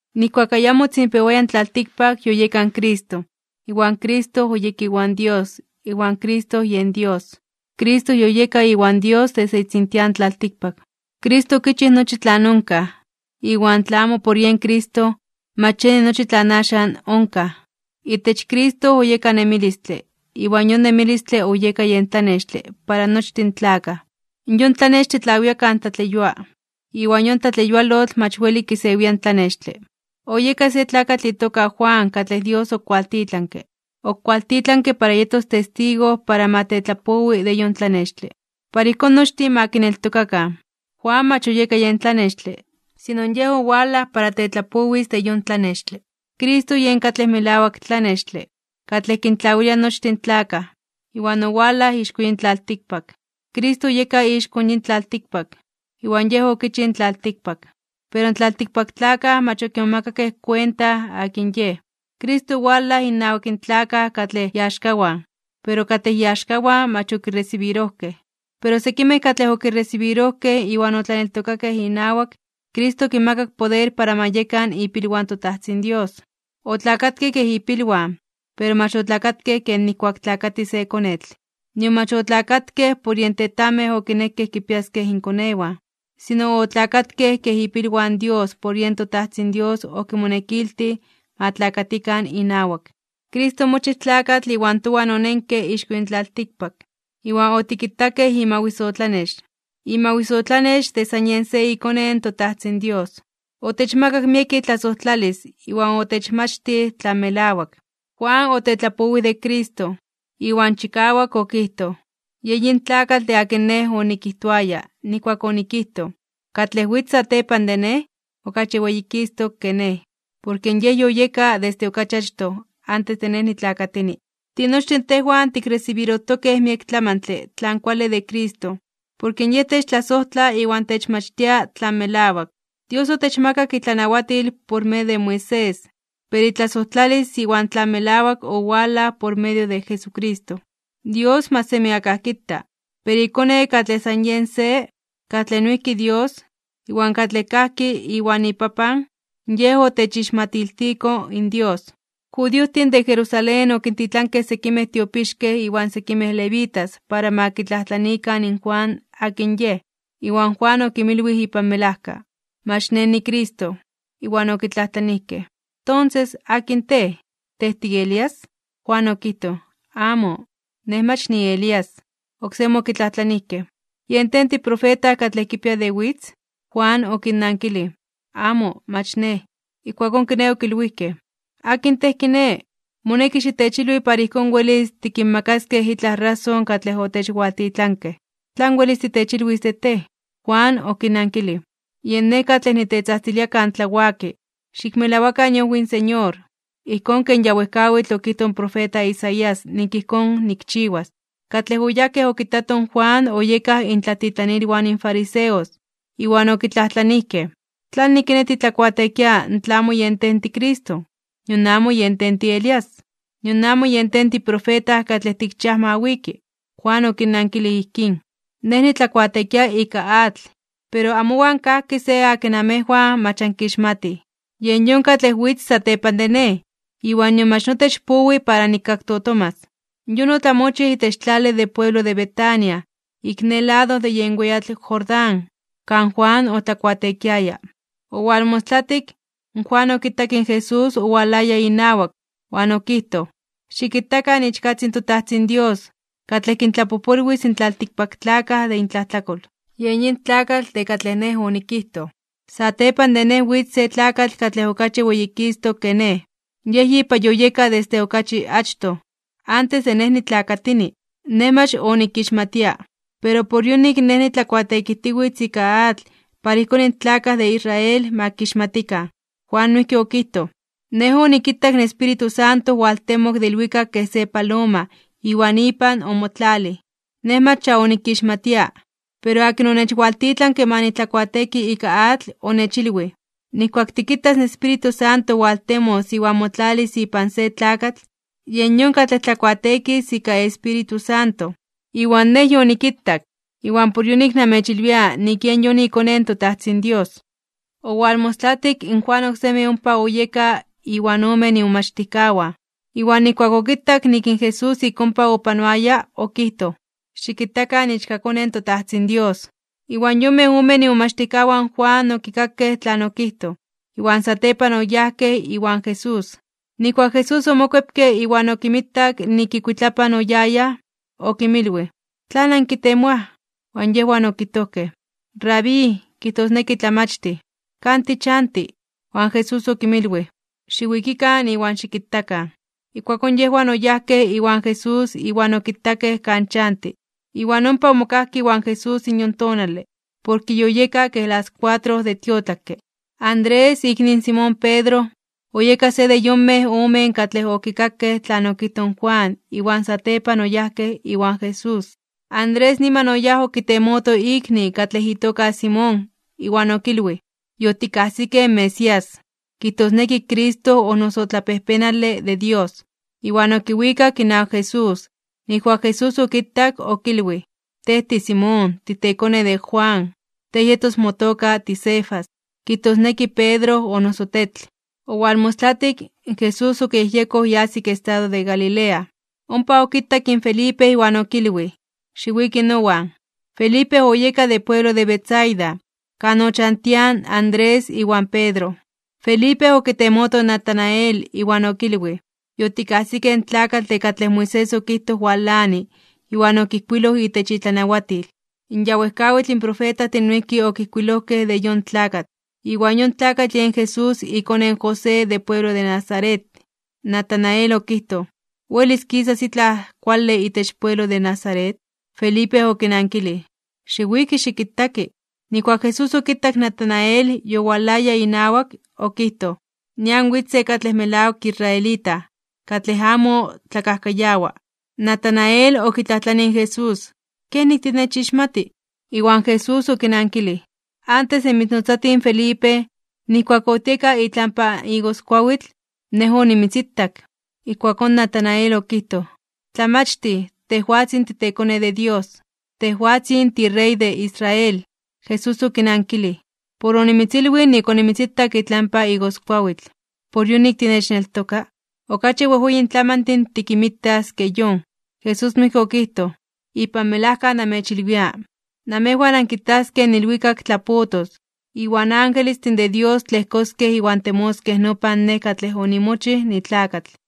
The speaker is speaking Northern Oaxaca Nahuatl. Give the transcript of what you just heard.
Nijkuak ayamo otzinpewaya in tlaltikpak, yoyeka in Cristo, iwan Cristo oyeka iwan Dios, iwan Cristo yen Dios. Cristo yoyeka iwan Dios desde itzintian tlaltikpak. Cristo okichij nochi tlan onkaj, iwan tla amo por yen Cristo, mach yeni nochi tlan axan onkaj. Itech Cristo oyeka nemilistle, iwan yon nemilistle oyeka yen tlanextle para nochtin in tlakaj. Yon tlanextle tlawia kan tlatleyua. Iwan yon tlatleyualotl mach weli kisewia in tlanextle. Oyeka se tlakatl itoka Juan katlej Dios okualtitlanke. Okualtitlanke para yetos testigo para ma tetlapowi de yon tlanextle, para ijkón nochtin ma kineltokakan. Juan mach oyeka yen tlanextle, sino yej owalaj para tetlapowis de yon tlanextle. Cristo yen katlej melawak tlanextle, katlej kintlawilia nochtin in tlakaj, iwan owalaj ixko yin tlaltikpak. Cristo oyeka ixko yin tlaltikpak, iwan yen okichij in tlaltikpak. Pero in tlaltikpaktlakaj mach okimomakakej kuenta akin Yej. Cristo owalaj innawak in tlakaj katlej iaxkawan, pero katlej iaxkawan mach okiresibirojkej. Pero sekimej katlej okiresibirojkej iwan otlaneltokakej inawak, Cristo okinmakak poder para ma yekan ipilwan toTajtzin Dios. Otlakatkej kej ipilwan, pero mach otlakatkej ken nijkuak tlakati se konetl. Nion mach otlakatkej por yen tetajmej okinekej kinpiaskej inkonewan, sino otlakatkej kej ipilwan Dios porke yen toTajtzin Dios okimonekiltij ma tlakatikan inawak. Cristo omochij tlakatl iwan towan onenke ixko yin tlaltikpak, iwan otikitakej imawisotlanex, imawisotlanex de san Yej se iKone in toTajtzin Dios. Otechmakak miek itlasojtlalis iwan otechmachtij tlan melawak. Juan otetlapowij de Cristo, iwan chikawak okijtoj: ―Yen yin tlakatl de akin nej onikijtoaya nijkuak onikijtoj: “Katlej witz satepan de nej, okachi weyikistok (weyititok) ke nej, porke Yej yoyeka desde okachi achtoj antes de nej nitlakatini.” Tinochtin tejwan tikresibirojtokej miek tlamantle tlan kuale de Cristo. Porke Yej techtlasojtla iwan techmachtia tlan melawak. Dios otechmakak itlanawatil por medio de Moisés. Pero itlasojtlalis iwan tlan melawak owalaj por medio de Jesucristo. Dios mach semi akaj kita. Pero iKone katlej san Yej se, katlej noijki Dios, iwan katlej kajki iwan iPapan, yen otechixmatiltiko in Dios. In judiojtin de Jerusalén okintitlankej sekimej tiopixkej iwan sekimej levitas para ma kitlajtlaniikan in Juan akin yej. Iwan Juan okinmilwij ipan melajka: ―Mach nej niCristo. Iwan okitlajtlanijkej: ―Tonses, ¿akin tej? ¿Tej tiElías? Juan okijtoj: ―Amo, nej mach niElías. Oksemi okitlajtlanijkej: ―¿Yen tej tiprofeta katlej kipia de witz? Juan okinnankilij: ―Amo, mach nej. Ijkuakón kiné okilwijkej: ―¿Akin tej kiné? Moneki xitechilwi para ijkón welis tikinmakaskej itlaj rason katlej otechwaltitlankej. ¿Tlan welis titechilwis de tej? Juan okinnankilij: ―Yen Nej katlej nitetzajtzilia kan tlawaki: “Xikmelawakan iojwi in Señor” ―ijkón ken ya wejkawitl okijtoj in profeta Isaías nik ijkón nikchiwas. Katlej oyajkej okitatoj in Juan oyekaj intlatitlanilwan in fariseos. Iwan okitlajtlanijkej: ―¿Tlanik kiné titlakuateekia tla amo yen tej tiCristo, nion amo yen tej tiElías, nion amo yen tej tiprofeta katlej tikchiaj ma wiki? Juan okinnankilij ijkín: ―Nej nitlakuateekia ika atl. Pero amowan kajki se akin namejwan mach ankixmatij. Yen yon katlej witz satepan de nej. Iwan nion mach notech powi para nikaktotomas. Yon otlamochij itech tlale de pueblo de Betábara, ik ne lado de yen weyatl Jordán, kan Juan otlakuateekiaya. Owalmostlatik, Juan okitak in Jesús owalaya inawak, iwan okijtoj: ―Xikitakan iichkatzin in toTajtzin Dios, katlej kintlapojpolwis in tlaltikpaktlakaj de intlajtlakol. Yen yin tlakatl de katlej nej onikijtoj: “Satepan de nej witz se tlakatl katlej okachi weyikistok (weyititok) ke nej. Yej yipa yoyeka desde okachi achtoj, antes de nej nitlakatini.” Nej mach onikixmatia. Pero por yonik nej nitlakuateekijtiwitz ika atl para ijkón in tlakaj de Israel ma kixmatikan. Juan noijki okijtoj: ―Nej onikitak in Espíritu Santo owaltemok de ilwikak kej se paloma iwan ipan omotlalij. Nej mach ya onikixmatia, pero akin onechwaltitlanke ma nitlakuateeki ika atl, onechilwij: “Nijkuak tikitas in Espíritu Santo waltemos iwan motlalis ipan se tlakatl, yen yon katlej tlakuateekis ika Espíritu Santo.” Iwan nej yonikitak, iwan por yonik namechilwia nik yen yon iKone in toTajtzin Dios. Owalmostlatik, in Juan oksemi ompa oyeka iwan omen imomachtijkawan. Iwan nijkuak okitak nik in Jesús ik ompa opanoaya, okijtoj: ―Xikitakan iichkaKone in toTajtzin Dios. Iwan yonmej omen imomachtijkawan in Juan okikakej tlan okijtoj. Iwan satepan oyajkej iwan Jesús. Nijkuak in Jesús omokuepke iwan okinmitak nik ikuitlapan oyayaj, okinmilwij: ―¿Tlan ankitemoaj? Iwan yejwan okijtojkej: ―Rabí ―kijtosneki Tlamachtij―, ¿kan tichanti? Iwan Jesús okinmilwij: ―Xiwikikan iwan xikitakan. Ijkuakón yejwan oyajkej iwan Jesús iwan okitakej kan chanti, iwan ompa omokajkej iwan Jesús yon tonale, porke yoyeka kej las kuatro de tiotlakke. Andrés, ikni in Simón Pedro, oyeka se de yonmej omen katlej okikakej tlan okijtoj in Juan iwan satepan oyajkej iwan Jesús. Andrés niman oyáj okitemoto ikni katlej itoka Simón, iwan okilwij: ―Yotikajsikej in Mesías ―kijtosneki Cristo o noso Tlapejpenale de Dios. Iwan okiwikak inawak Jesús. Nijkuak in Jesús okitak, okilwij: ―Tej tiSimón, titekone de Jonás. Tej yetos motoka tiCefas ―kijtosneki Pedro o noso Tetl. Owalmostlatik, in Jesús okiyejyekoj yas ik estado de Galilea. Ompa okitak in Felipe iwan okilwij: ―Xiwiki nowan. Felipe oyeka de pueblo de Betsaida, kan ochantiaj Andrés iwan Pedro. Felipe okitemoto in Natanael, iwan okilwij: ―Yotikajsikej in tlakatl de katlej Moisés okijtoj walani iwan okijkuiloj itech itlanawatil. In ya wejkawitl profetajtin noijki okijkuilojkej de yon tlakatl. Iwan yon tlakatl yen Jesús ikone in José de pueblo de Nazaret. Natanael okijtoj: ―¿Welis kisas itlaj kuale itech pueblo de Nazaret? Felipe okinankilij: ―Xiwiki xikitaki. Nijkuak in Jesús okitak in Natanael yowalaya inawak, okijtoj: ―Nian witz se katlej melawak israelita, katlej amo tlakajkayawa. Natanael okitlajtlanij in Jesús: ―¿Kenik tinechixmati? Iwan Jesús okinankilij: ―Antes de mitznotzati in Felipe, nijkuak otieka itlampa igoskuawitl, Nej onimitzitak. Ijkuakón Natanael okijtoj: ―Tlamachtij, tejwatzin titeKone de Dios. Tejwatzin tiRey de Israel. Jesús okinankilij: ―Por onimitzilwij nik onimitzitak itlampa igoskuawitl, ¿por yonik tinechneltoka? Okachi wejweyin tlamantin tikinmitas ke yon. Jesús noijki okijtoj: ―Ipan melajka namechilwia, namejwan ankitaskej in ilwikak tlapotos, iwan angelestin de Dios tlejkoskej iwan temoskej nopan Nej katlej onimochij nitlakatl.